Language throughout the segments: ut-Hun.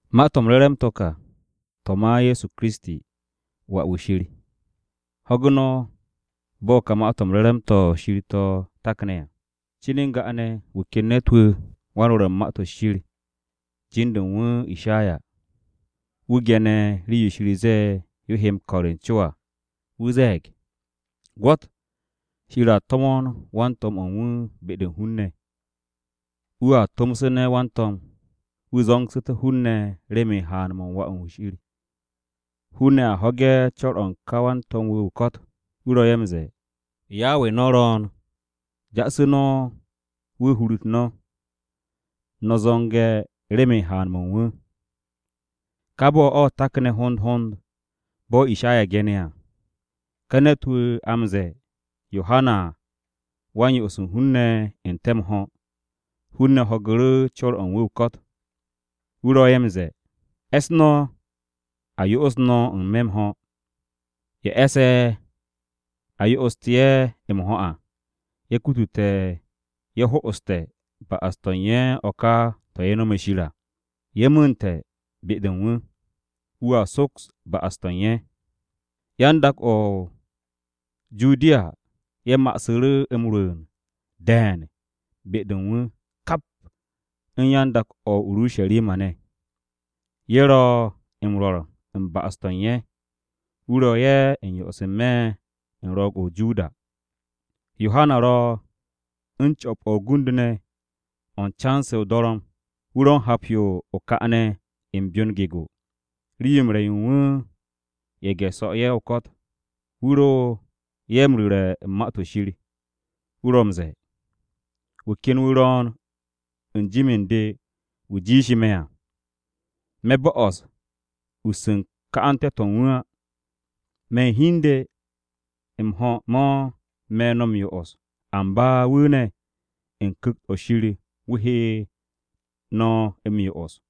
Ma-to̱ m-Re̱re̱m to̱ ka, to̱ ma Ye̱so Kiristi,Wà-wu̱ Shir. Ho̱gu̱ no̱ bo̱ ka Ma-to̱ m-Re̱re̱m to̱ Shir to̱ takne̱ à. Cin n-ga ne̱ wu̱ ken ne̱t-wu̱, wan-Rwo̱r u̱n Ma-to̱ Shir, jin-de u̱n wu̱ Ishaya. Wu̱ ge̱ne̱ rii-yo Shir ze̱e̱ yo he m-ko̱r u̱n co à. Wu̱ ze̱e̱g, “Gwo̱t Shir a to̱mo̱n wan-to̱m o̱ u̱n wu̱ be-de u̱n hun-ne̱. Wu̱a to̱msu̱ne̱ wan-to̱m, wu̱ zo̱ngsu̱té̱ hun-ne̱ remen haan-mo̱ u̱n Wà-wu̱ Shir.” “Hun-ne̱ a ho̱ge̱ co̱r-o̱ u̱n ka wan-to̱m-wu̱ o-ko̱t. Wu̱ ro̱ ye̱ m-ze̱e̱, ‘Yawe no̱ ro̱o̱n. Ja'asu̱ no̱ wu̱ hur-u̱r no̱. No̱ zo̱nge̱ remen haan-mo̱ u̱n wu̱.’” Ka bo̱-o̱ takne̱ hond hond bo̱ Ishaya ge̱ne̱ à. Ka ne̱t-wu̱ a m-ze̱e̱ Yohana Wa-m-Yo'os u̱n hun-ne̱ m-ho̱, hun-ne̱ ho̱gu̱ru̱ co̱r-o̱ u̱n wu̱ o-ko̱t. Wu̱ ro̱ ye̱ m-ze̱e̱, “E̱s no̱ a yo'os no̱ n-me̱ m-ho̱. Ye̱ e̱sse̱ a yo'oste̱ ye̱ n-me̱ m-ho̱ à, ye̱ kutute̱ ye̱ ho'oste̱ ba'as-to̱ u̱n ye̱ o̱ ka to̱ ye̱ nome̱ Shir à. Ye̱ mu̱u̱nte̱ be-de u̱n wu̱. Wu̱a soks ba'as-to̱ u̱n ye̱.” Yan-dak-o̱ o-Judiya ye̱ ma'asu̱ru̱ m-rwu̱u̱n de̱e̱n be-de u̱n wu̱, kap u̱n yan-dak-o̱ o-Urusharima ne̱. Ye̱ ro̱ m-rwo̱r u̱n ba'as-to̱ u̱n ye̱. Wu̱ ro̱ ye̱ m-yo'os n-me̱ u̱n Ro̱o̱g-o̱ o-Joda. Yohana ro̱ u̱n co̱p-o̱ o-gund ne̱, o̱ u̱n can-se o-dorom. Wu̱ ro̱ u̱n hap-yo o-ka ne̱ u̱n byon gego. Rii-yo m-re̱ yo u̱n wu̱, ye̱ge̱-'e ye̱ u̱n so̱ ne̱ ye̱ o-ko̱t. Wu̱ ro ye̱ m-ru̱re̱ u̱n Ma-to̱ Shir. Wu̱ ro̱ m-ze̱e̱, “Wu̱ ken wu̱ ro̱o̱n u̱n jim u̱n de wu̱ jiishe̱ me̱ à. Me̱ bo'os us u̱n ka'ante̱-to̱ u̱n wu̱ á. Me̱ u̱n hi u̱n de, m-ho̱ mo̱ me̱ no̱ m-yo'os, amba wu̱ ne̱, u̱n Ku̱kt-o̱ Shir wu̱ he no̱ m-yo'os.”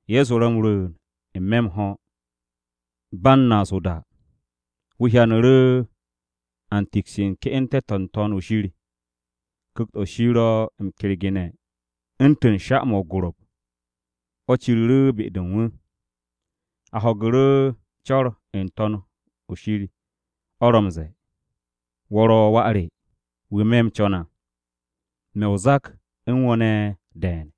Ye̱so ro̱ m-rwu̱u̱n n-me̱ m-ho̱, ba u̱n naas o-da, wu̱ hyanu̱ru̱ a m-tiks u̱t-ke'ente̱ n-To̱n o̱ shir. Ku̱kt-o̱ Shir ro̱ m-kergene̱ u̱ntu̱n sha-mo̱ o-gorop, o̱ ciru̱ru̱ be-de u̱n wu̱. A ho̱gu̱ru̱ co̱r n-To̱n o̱ Shir. O̱ ro̱ m-ze̱e̱, “Wo̱ ro̱ Wà re, wu̱ me̱ m-co̱n à. Me̱ o-zak u̱n wo̱ ne̱ de̱e̱n.”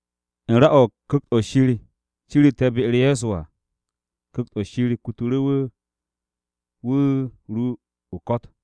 U̱n ra-o̱ Ku̱kt-o̱ Shir ciru̱te̱ be-u̱r Ye̱so à. Ku̱kt-o̱ Shir kutu̱ru̱ wu̱, wu̱ ru o-ko̱t.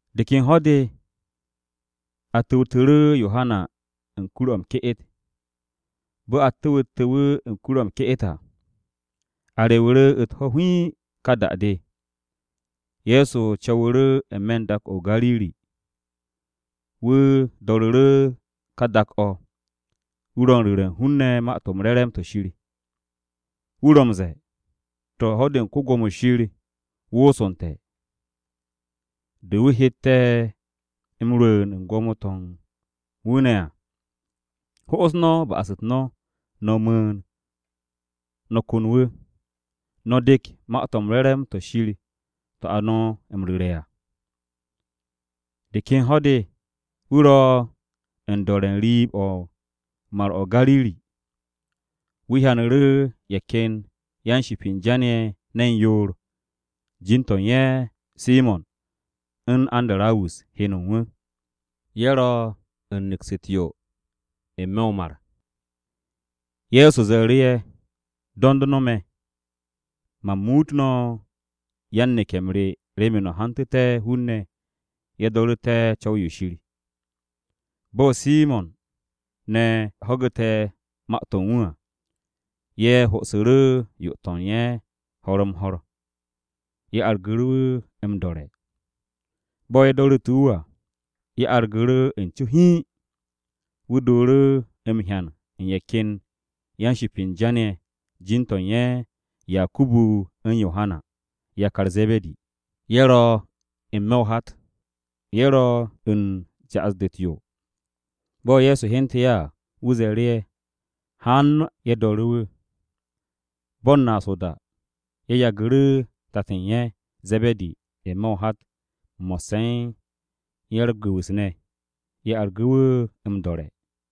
De ken ho̱-de, a tu̱wtu̱ru̱ Yohana u̱n kur-o̱ m-ke'et. Bo̱ a tu̱wte̱ wu̱ u̱n kur-o̱ m-ke'et à, a rewu̱ru̱ u̱t-ho̱ hiin ká da-de, Ye̱so co̱wu̱ru̱ n-me̱ u̱n dak-o̱ o-Gariri. Wu̱ do̱ru̱ru̱ ka dak-o̱, wu̱ ro u̱n ru̱re̱ u̱n hun-ne̱ Ma-to̱ m-Re̱re̱m to̱ Shir. Wu̱ ro̱ m-ze̱e̱, “Ho̱-de u̱n ko-Gwo̱mo Shir wosonte̱, de wu̱ hette̱ m-rwu̱u̱n u̱n gwo̱mo-to̱ u̱n wu̱ ne̱ à. Ho'os no̱ ba'as-u̱t no̱, no̱ mu̱u̱n, no̱ kon wu̱. No̱ de̱k Ma-to̱ m-Re̱re̱m to̱ Shir to̱ a no̱ m-ru̱re̱ à.” De ken ho̱-de, wu̱ ro̱ u̱n do̱re̱ u̱n riib-o̱ u̱n Mar-o̱ o-Gariri. Wu̱ hyanu̱ru̱ ye̱ ken yan-ship u̱n jan-ye̱ ne̱n yoor. Jin-to̱ u̱n ye̱ Simo̱n u̱n Andarawus heno u̱n wu̱. Ye̱ ro̱ u̱n neks u̱t-yo n-me̱ o-mar. Ye̱so ze̱e̱ru̱ ye̱, “Do̱nd no̱ me̱, man muut no̱ yan-neke̱-m re remen no̱ hantu̱té̱ hun-ne̱ ye̱ do̱ru̱te̱ co̱w-yo Shir.” Bo̱ Simo̱n ne̱ ho̱gu̱te̱ ma-to̱ u̱n wu̱ à, ye̱ ho'osu̱ru̱ yo-to̱ u̱n ye̱ ho̱r-m-ho̱r. Ye̱ argu̱ru̱ wu̱ m-do̱re̱. Bo̱ ye̱ do̱ru̱te̱ wu̱ à, ye̱ argu̱ru̱ u̱n co hiin. Wu̱ dooru̱ m-hyan u̱n ye̱ ken yan-ship u̱n jan-ye̱. Jin-to̱ u̱n ye̱ Yakubu u̱n Yohana, yakar Ze̱be̱di. Ye̱ ro̱ n-me̱ o-hat. Ye̱ ro̱ u̱n ja'as-de u̱t-yo. Bo̱ Ye̱so hyente̱ ye̱ à, wu̱ ze̱e̱ru̱ ye̱ haan ye̱ do̱re̱ wu̱. Ba u̱n naas o-da, ye̱ yagu̱ru̱ tat u̱n ye̱ (Ze̱be̱di) n-me̱ o-hat mo̱sse̱ u̱n ya-u̱r-gu̱wu̱s ne̱. Ye̱ argu̱ru̱ wu̱ m-do̱re̱.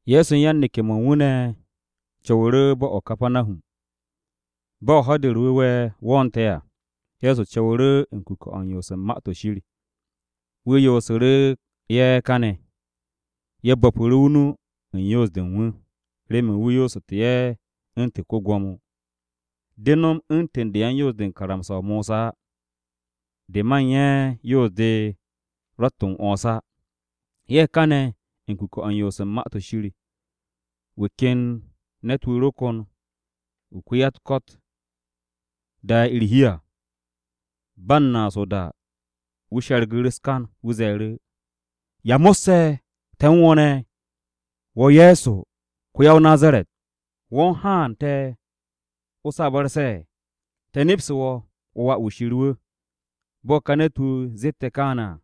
Ye̱so u̱n yan-neke̱-mo̱ u̱n wu̱ ne̱ co̱wu̱ru̱ bo̱-o̱ o-Kapanahum. Bo̱ Ho̱-de u̱r-Wu̱we̱ wo̱o̱nte̱ à, Ye̱so co̱wu̱ru̱ u̱n kuke̱-o̱ u̱n yoos u̱n Ma-to̱ Shir. Wu̱ yoosu̱ru̱ ye̱ kane̱. Ye̱ bo̱pu̱ru̱ o-nu u̱n yoos-de u̱n wu̱, remen wu̱ yoosu̱te̱ ye̱ u̱ntu̱n ko-gwo̱mo. De no̱m u̱ntu̱n de u̱n yan-Yoos-de u̱n karamsa-o Mosa á. De ma u̱n ye̱, yoos-de ro̱tt m-'wo̱ns á. Ye̱ kane̱ u̱n kuke̱-o̱ u̱n yoos u̱n Ma-to̱ Shir, wu̱ ken ne̱t-wu̱ ro kon wu̱ ko-ya-u̱t-ko̱t da'e̱ u̱r-hi à. Ba u̱n naas o-da wu̱ she̱rgu̱ru̱ u̱s-kan. Wu̱ ze̱e̱ru̱, “¿Ya mo̱sse̱ te̱ u̱n wo̱ ne̱, wo̱ Ye̱so ko-ya-o-Nazaret? ¿Wo̱ u̱n haan te̱ o̱ m-sabarse̱? Te̱ nepste̱ wo̱, Wo̱ ro̱ ko-wan-ba-m-ku̱ko̱p wu̱ Shir!” Bo̱ ka ne̱t-wu̱ zette̱ kaane̱ à,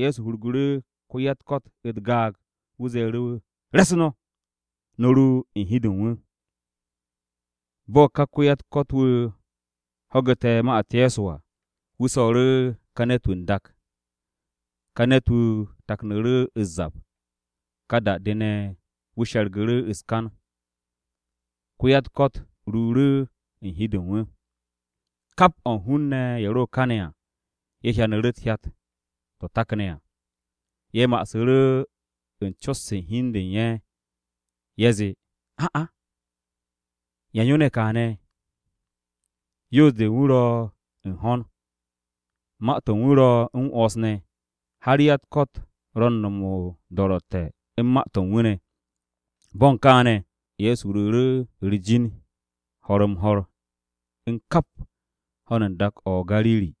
Ye̱so hurgu̱ru̱ ko-ya-u̱t-ko̱t u̱t-gaag. Wu̱ ze̱e̱ru̱ wu̱, “Re̱s no̱, no̱ ru u̱n hi-de u̱n wu̱!” Bo̱ ka ko-ya-u̱t-ko̱t-wu̱ ho̱gu̱te̱ ma-u̱t Ye̱so à, wu̱ so̱ru̱ ka ne̱t-wu̱ n-dak. Ka ne̱t-wu̱ taknu̱ru̱ u̱s-zap. Ka da-de ne̱, wu̱ she̱rgu̱ru̱ u̱s-kan, ko-ya-u̱t-ko̱t ruuru̱ u̱n hi-de u̱n wu̱. Kap o̱ u̱n hun-ne̱ ye̱ ro kane̱ à, ye̱ hyanu̱ru̱ hyat-to̱ takne̱ à. Ye̱ ma'asu̱ru̱ u̱n cot-se u̱n hi u̱n de u̱n ye̱. Ye̱ zee, “¿A'a, yan yo ne̱ kaane̱? Yoos-de u̱n wu̱ ro̱ u̱n ho̱n. Ma-to̱ u̱n wu̱ ro̱ m-'wo̱ns ne̱, har ya-u̱t-ko̱t ro̱ u̱n m-no̱m o-do̱ro̱tte̱ u̱n ma-to̱ u̱n wu̱ ne̱.” Bo̱ u̱n kaane̱, Ye̱so ruuru̱ u̱r-jin ho̱r-m-ho̱r u̱n kap ho̱n u̱n dak-o̱ o-Gariri.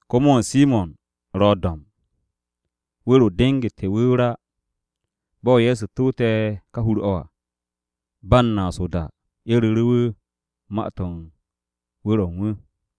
Ko-mo̱o̱n Simo̱n ro̱ do̱mb. Wu̱r-o dengu̱te̱ wu̱ o-ra. Bo̱ Ye̱so tu̱wte̱ ká hur-o̱ à, ba m-naas o-da, ye̱ ru̱ru̱ wu̱ ma-to̱ u̱n wu̱r-o u̱n wu̱.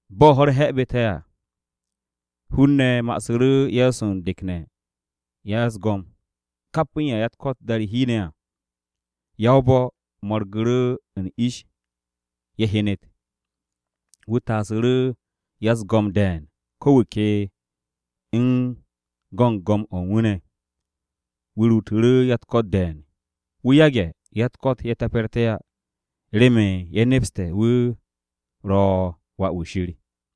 Bo̱ ho̱-u̱r he̱bu̱te̱ à, hun-ne̱ ma'asu̱ru̱ Ye̱so u̱n dekne̱ u̱n ya-u̱s-go̱m, kap u̱n ye̱ ya-u̱t-ko̱t da'e̱ u̱r-hi ne̱ à. Ya-o-bo̱ mo̱rgu̱ru̱ u̱n ish ye̱ hyenet. Wu̱ taasu̱ru̱ ya-u̱s-go̱m de̱e̱n ko̱ wu̱ ke u̱n go̱n go̱m-o̱ u̱n wu̱ ne̱. Wu̱ ruutu̱ru̱ ya-u̱t-ko̱t de̱e̱n. Wu̱ yage̱ ya-u̱t-ko̱t ye̱ te̱pe̱rte̱ á, remen ye̱ nepste̱ wu̱ ro̱ Wà-wu̱ Shir.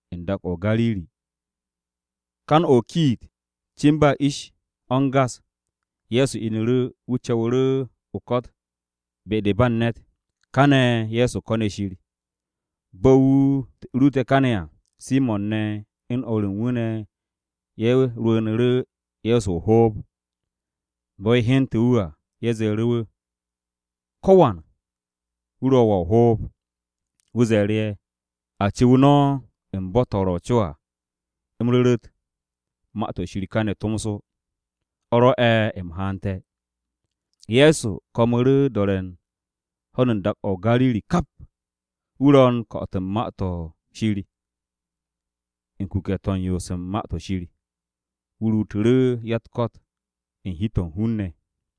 U̱n kan-o̱ o-kiit, cin ba ish-o̱ u̱n gas. Ye̱so inu̱ru̱. Wu̱ co̱wu̱ru̱ o-ko̱t be-de ba u̱n ne̱t. Kane̱ Ye̱so ko̱ne̱ Shir. Bo̱ wu̱ ruute̱ kane̱ à, Simo̱n ne̱ u̱n o̱r u̱n wu̱ ne̱ ye̱ rwu̱u̱nu̱ru̱ Ye̱so o-hoob. Bo̱ ye̱ hyente̱ wu̱ à, ye̱ ze̱e̱ru̱ wu̱, “Ko̱wan wu̱ ro̱ wo̱ o-hoob.” Wu̱ ze̱e̱ru̱ ye̱, “A cu̱w no̱ u̱n bo̱-to̱ ro̱ o-co à, u̱m ru̱ru̱t Ma-to̱ Shir kane̱ tomso. O̱ rwo̱'e̱ u̱m haante̱.” Ye̱so ko̱mu̱ru̱ do̱re̱ u̱n ho̱n u̱n dak-o̱ o-Gariri kap, wu̱ ro̱ u̱n ko̱'o̱t u̱n Ma-to̱ Shir u̱n kuke̱-to̱ u̱n yoos u̱n Ma-to̱ Shir. Wu̱ ruutu̱ru̱ ya-u̱t-ko̱t u̱n hi-to̱ u̱n hun-ne̱.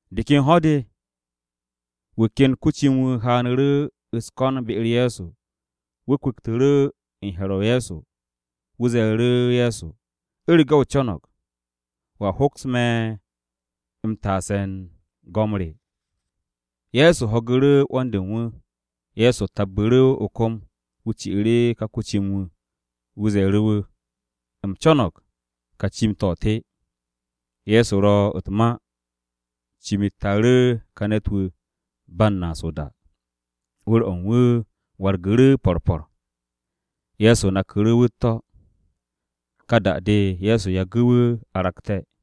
De ken ho̱-de, wu̱ ken ko-cim-wu̱ haanu̱ru̱ u̱s-ko̱n be-u̱r Ye̱so. Wu̱ kwu̱ktu̱ru̱ u̱n he̱r-o Ye̱so. Wu̱ ze̱e̱ru̱ Ye̱so, “U̱rege̱ o co̱no̱g, wo̱a hoks me̱ m-taase̱ u̱n go̱m re.” Ye̱so ho̱gu̱ru̱ 'wo̱n-de u̱n wu̱, Ye̱so tabbu̱ru̱ o-kom, wu̱ ci'u̱ru̱ ká ko-cim-wu̱, Ye̱so ze̱e̱ru̱ wu̱, “U̱m co̱no̱g, ka cim-to̱ te.” Ye̱so ro̱ u̱t-ma, cim-u̱t taaru̱ ka ne̱t-wu̱ ba u̱n naas o-da. Wu̱r-o̱ u̱n wu̱ wargu̱ru̱ po̱r po̱r. Ye̱so naku̱ru̱ wu̱ u̱t-to̱, ka da-de Ye̱so yagu̱ wu̱ aragte̱.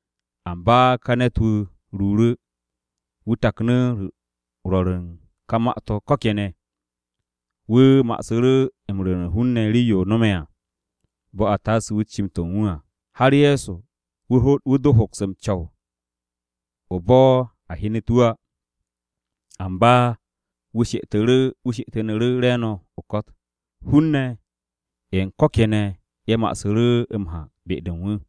Amba ka ne̱t-wu̱ ruuru̱, wu̱ taknu̱ rwo̱r u̱n ka ma-to̱ ko̱ kene̱. Wu̱ ma'asu̱ru̱ m-ru̱re̱ u̱n hun-ne̱ rii-yo no̱me̱ à. Bo̱ a taase wu̱ cim-to̱ u̱n wu̱ à, har Ye̱so wu̱ do hoks m-co̱w o-bo̱ a hyenet wu̱ á. Amba wu̱ she'etu̱nu̱ru̱ re̱e̱no̱ o-ko̱t. Hun-ne̱ ye̱ u̱n ko̱ kene̱ ye̱ ma'asu̱ru̱ m-ha be-de u̱n wu̱.